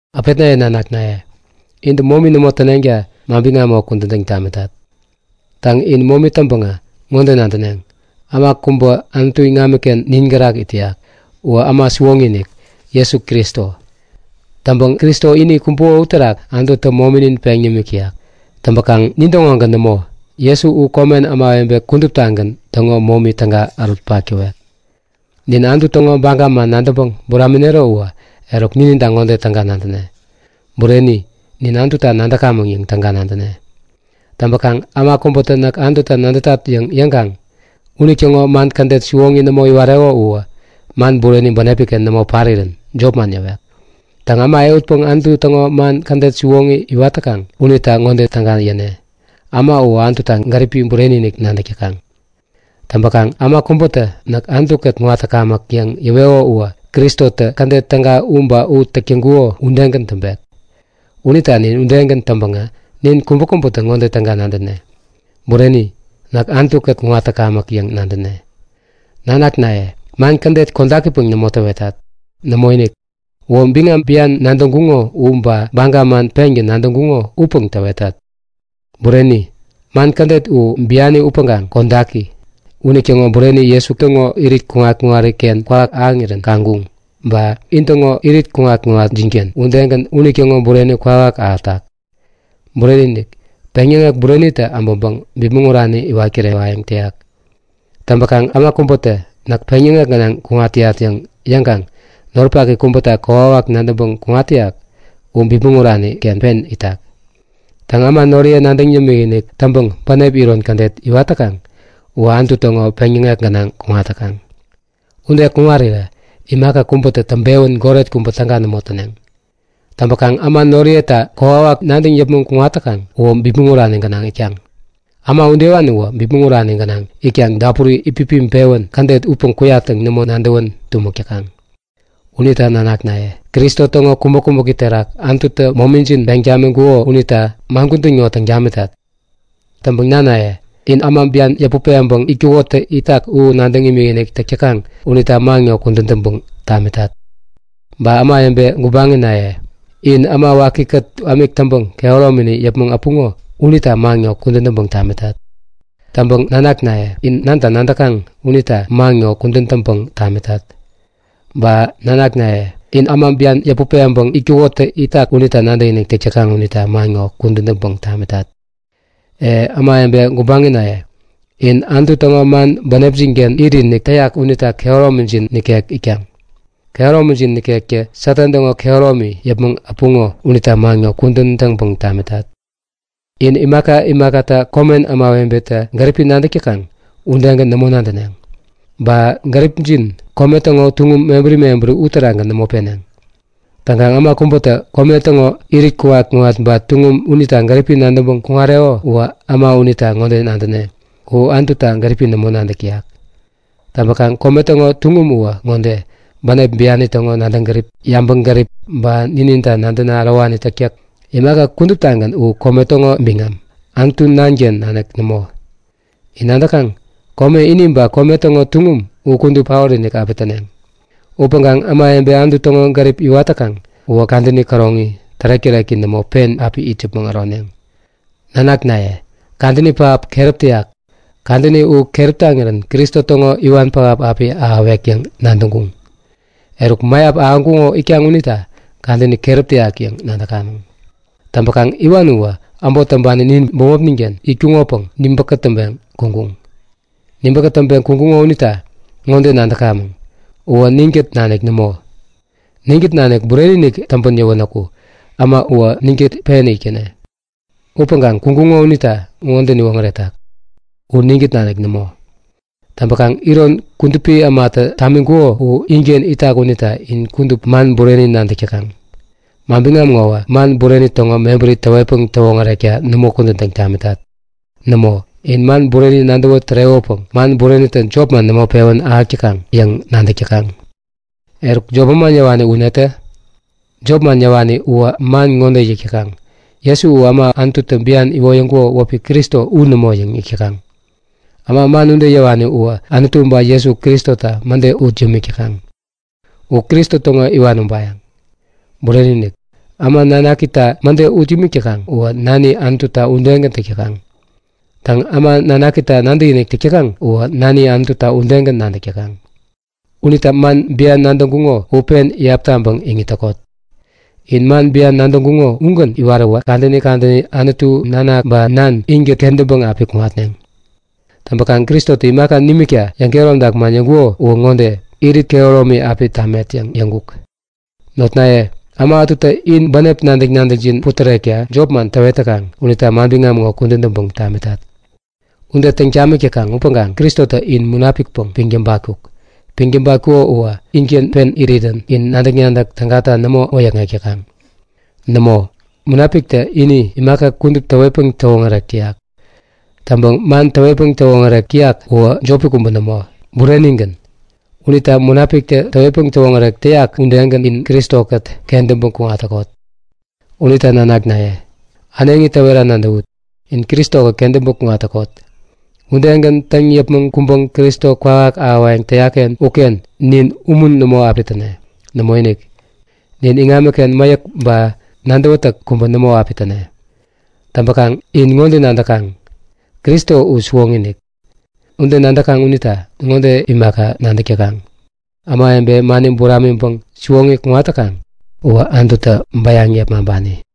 Äpetnaye nanaknaye, intä momi nämo täneŋta manbiŋam ŋo kudän täŋ tamitat. Täŋ, in momi täŋpäŋä ŋode nadäneŋ; Äma kubä Anutu iŋamiken nin gärak it täyak. Uwä äma siwoŋi-inik, Jesu Kristo. Täŋpäŋ Kristo ini kumbuko uterak Anututä mominin peŋ nimik täyak. Täŋpäkaŋ nintäŋogän nämo, Jesu u komen äma kuduptagän täŋo momi täga ärutpak täwek. Nin Anutu täŋo baga man nadäŋpäŋ buraminero uwä, eruk nininta ŋode täga nadäne; Bureni, nin Anututa nadäkamäŋ yäŋ täga nadäne. Täŋpäkaŋ, äma kubätä Näk Anututa nadätat yäŋ yäŋkaŋ unitäŋo man kädet siwoŋi nämo iwareko uwä man bureni bänepi-ken nämo parirän jopman yäwek. Täŋ, äma ehutpäŋ Anutu täŋo man kädet siwoŋi iwat täkaŋ unita ŋode täga yäne; Äma u Anututa gäripi bureni-inik nadäk täkaŋ. Täŋpäkaŋ äma kubätä näk Anutu-kät kuŋat täkamäk yäŋ yäweko uwä Kristotä kädet täga u ba u täk täŋkuko udegän täŋpek. Unita nin udegän täŋpäŋä nin kubäkubätä ŋode täga nadäne; Bureni, näk Anutu-kät kuŋat täkamäk yäŋ nadäne. Nanaknaye, man kädet kodakipäŋ nämo täwetat. Nämoinik, uwä biŋam bian nadäŋkuŋo u ba baga man pengän nadäŋkuŋo upäŋ täwetat. Bureni, man kädet u biani upäŋkaŋ kodaki. Unitäŋo bureni Jesu täŋo irit kuŋat-kuŋariken kwawak ahäŋirän kaŋkuŋ ba in täŋo irit kuŋat-kuŋatjinken udegän unitäŋo bureni kwawak ahätak. Bureni-inik, peŋyäŋek burenitä äbäŋpäŋ bipmäŋ urani iwat kirewayäŋ täyak. Täŋpäkaŋ äma kubätä Näk peŋyäŋek gänaŋ kuŋat täyat yäŋ yäŋkaŋ noripak kubäta kokwawak nadäŋpäŋ kuŋat täyak u bipmäŋ urani-ken pen itak. Täŋ, äma noriye nadäŋ yämikinik täŋpäŋ bänep iron kädet iwat täkaŋ uwä Anutu täŋo peŋyäŋek gänaŋ kuŋat täkaŋ. Ude kuŋarirä imaka kubätä täŋpewän goret kubä täga nämo täneŋ. Täŋpäkaŋ äma noriyeta kokwawak nadäŋ yäpmäŋ kuŋat täkaŋ uwä bipmäŋ urani gänaŋ itkaŋ. Äma udewani uwä bipmäŋ urani gänaŋ itkaŋ dapuri itpipiŋpewän kädet upäŋ kuyat yäŋ nämo nadäwän tumäk täkaŋ. Unita nanaknaye, Kristo täŋo kumäk-kumäki terak Anututä momijin peŋ tamiŋkuko unita man kudän ŋo täŋ tamitat. Täŋpäŋ nanaye, in äma bian yäput peŋpäŋ itkukotä itak u nadäŋ imikinik täk täkaŋ unita man ŋo kudän täŋpäŋ tamitat. Ba ämawebe gubaŋnaye, in Äma Wakikät ämik täŋpäŋ kehäromini yäpmäŋ äpuŋo unita man ŋo kudän täŋpäŋ tamitat. Täŋpäŋ nanaknaye, in Nanta nadäkaŋ unita man ŋo kudän täŋpäŋ tamitat. Ba nanaye, in äma bian yäput peŋpäŋ itkukotä itak unita nadäkinik täk täkaŋ unita man ŋo kudän täŋpäŋ tamitat. E, ämawebe gubaŋnaye, in Anutu täŋo man bänepjin-ken itinik täyak unita kehäromijin nikek itkaŋ. Kehäromijin nikektä Satan täŋo kehäromini yäpmäŋ äpuŋo unita man ŋo kudän täŋpäŋ tamitat. In imaka imakata komen ämawebetä gäripi nadäk täkaŋ udegän nämo nadäneŋ. Ba gäripjin kome täŋo tuŋum mebäri mebäri uterakgän nämo peneŋ. Täŋkaŋ äma kubätä kome täŋo irit kuŋat-kuŋat ba tuŋum unita gäripi nadäŋpeŋ kuŋareko uwä äma unita ŋode nadäne; U Anututa gäripi nämo nadäk täyak. Täŋpäkaŋ kome täŋo tuŋum uwä ŋode; Bänep biani täŋo nadäŋ gärip, yabäŋgärip ba nininta nadäna ärowani täktäk. Imaka kuduptagän u kome täŋo biŋam, Anutu Nanken nanik nämo. In nadäkaŋ? Kome ini ba kome täŋo tuŋum u kudup paot-inik api täneŋ. Upäŋkaŋ ämawebe Anutu täŋo gärip iwat täkaŋ uwä kadäni käroŋi, tärek-täreki nämo, pen api it yäpmäŋ äroneŋ. Nanaknaye, kadäni pähap keräp täyak! Kadäni u keräp taŋirän Kristo täŋo Iwan pähap api ahäwek yäŋ nadäŋkuŋ. Eruk, mäyap ahäŋkuŋo itkaŋ unita kadäni keräp täyak yäŋ nadäk täkamäŋ. Täŋpäkaŋ iwan uwä äbot täŋpani nin bämopnin-ken itkuŋopäŋ nibä kätäŋpeŋ kuŋkuŋ. Nibä kätäŋpeŋ kuŋkuŋo unita ŋode nadäkamäŋ; Uwä ninkät nanik nämo. Ninkät nanik bureni-inik täŋpän yäwänäku, äma uwä ninkät pen itkäne. Upäŋkaŋ kuŋkuŋo unita ŋode niwoŋärek täkaŋ; U ninkät nanik nämo. Täŋpäkaŋ iron, Kudupi Ämatä tamiŋkuko u inken itak unita in kudup man bureni nadäk täkaŋ. Manbiŋam ŋowä man bureni täŋo mebäri täwetpäŋ täwoŋärekta nämo kudän täŋ tamitat. Nämo, in man bureni nadäwä tärewäpäŋ man burenitä jopman nämo pewän ahäk täkaŋ yäŋ nadäk täkaŋ. Eruk, jop manman yäwani u netä? Jop manman yäwani uwä man ŋode yäk täkaŋ; Jesu u äma Anututä bian iwoyäŋkuko wäpi Kristo u nämo yäŋ yäk täkaŋ. Äma man ude yäwani uwä Anutu ba Jesu Kristota mäde ut yämik täkaŋ. U Kristo täŋo iwan ubayäŋ. Bureni-inik! Äma Nanakita mäde ut imik täkaŋ uwä Nani Anututa udegän täk täkaŋ. Täŋ, äma Nanakita nadäkinik täk täkaŋ uwä Nani Anututa udegän nadäk täkaŋ. Unita man bian nadäŋkuŋo u pen iyap taŋpäŋ iŋit täkot. In man bian nadäŋkuŋo ugän iwaräwä kadäni kadäni Anutu Nanak ba Nan inkät kentäŋpäŋ api kuŋatneŋ. Täŋpäkaŋ Kristotä imaka nimikta yäŋkehäromtak man yäŋkuko uwä ŋode; Irit kehäromi api tamet yäŋ yäŋkuk. Notnaye, äma ätutä in bänep nadäk-nadäkjin putärekta jopman täwet täkaŋ unita manbiŋam ŋo kudän täŋpäŋ tamitat. Ude täŋ tamik täkaŋ upäŋkaŋ Kristotä in Munapikpäŋ piŋ tabatkuk. Piŋ tabatkuko uwä inken pen irirän in nadäk-nadäk tägata nämo wäyäkŋek täkaŋ. Nämo, Munapiktä ini imaka kudup täwetpäŋ täwoŋärek täyak. Täŋpäŋ man täwetpäŋ täwoŋärek täyak uwä jopi kubä nämo, burenigän. Unita Munapiktä täwetpäŋ täwoŋärek täyak udegän in Kristo-kät kentäŋpäŋ kuŋat täkot. Unita nanaknaye, äneŋi täwera nadäwut; In Kristo-kät kentäŋpäŋ kuŋat täkot. Udegän täŋ yäpmäŋ kuŋtäŋgän Kristo kwawak ahäwayäŋ täyak-ken uken nin umun nämo api täne. Nämoinik, nin iŋamiken mäyäk ba nadäwätäk kubä nämo api täne. Täŋpäkaŋ in ŋode nadäk täkaŋ; Kristo u siwoŋi-inik. Ude nadäk täkaŋ unita ŋode imaka nadäk täkaŋ; Ämawebe mani buramiŋpäŋ siwoŋi kuŋat täkaŋ uwä Anututä bäyaŋ yepmaŋpani.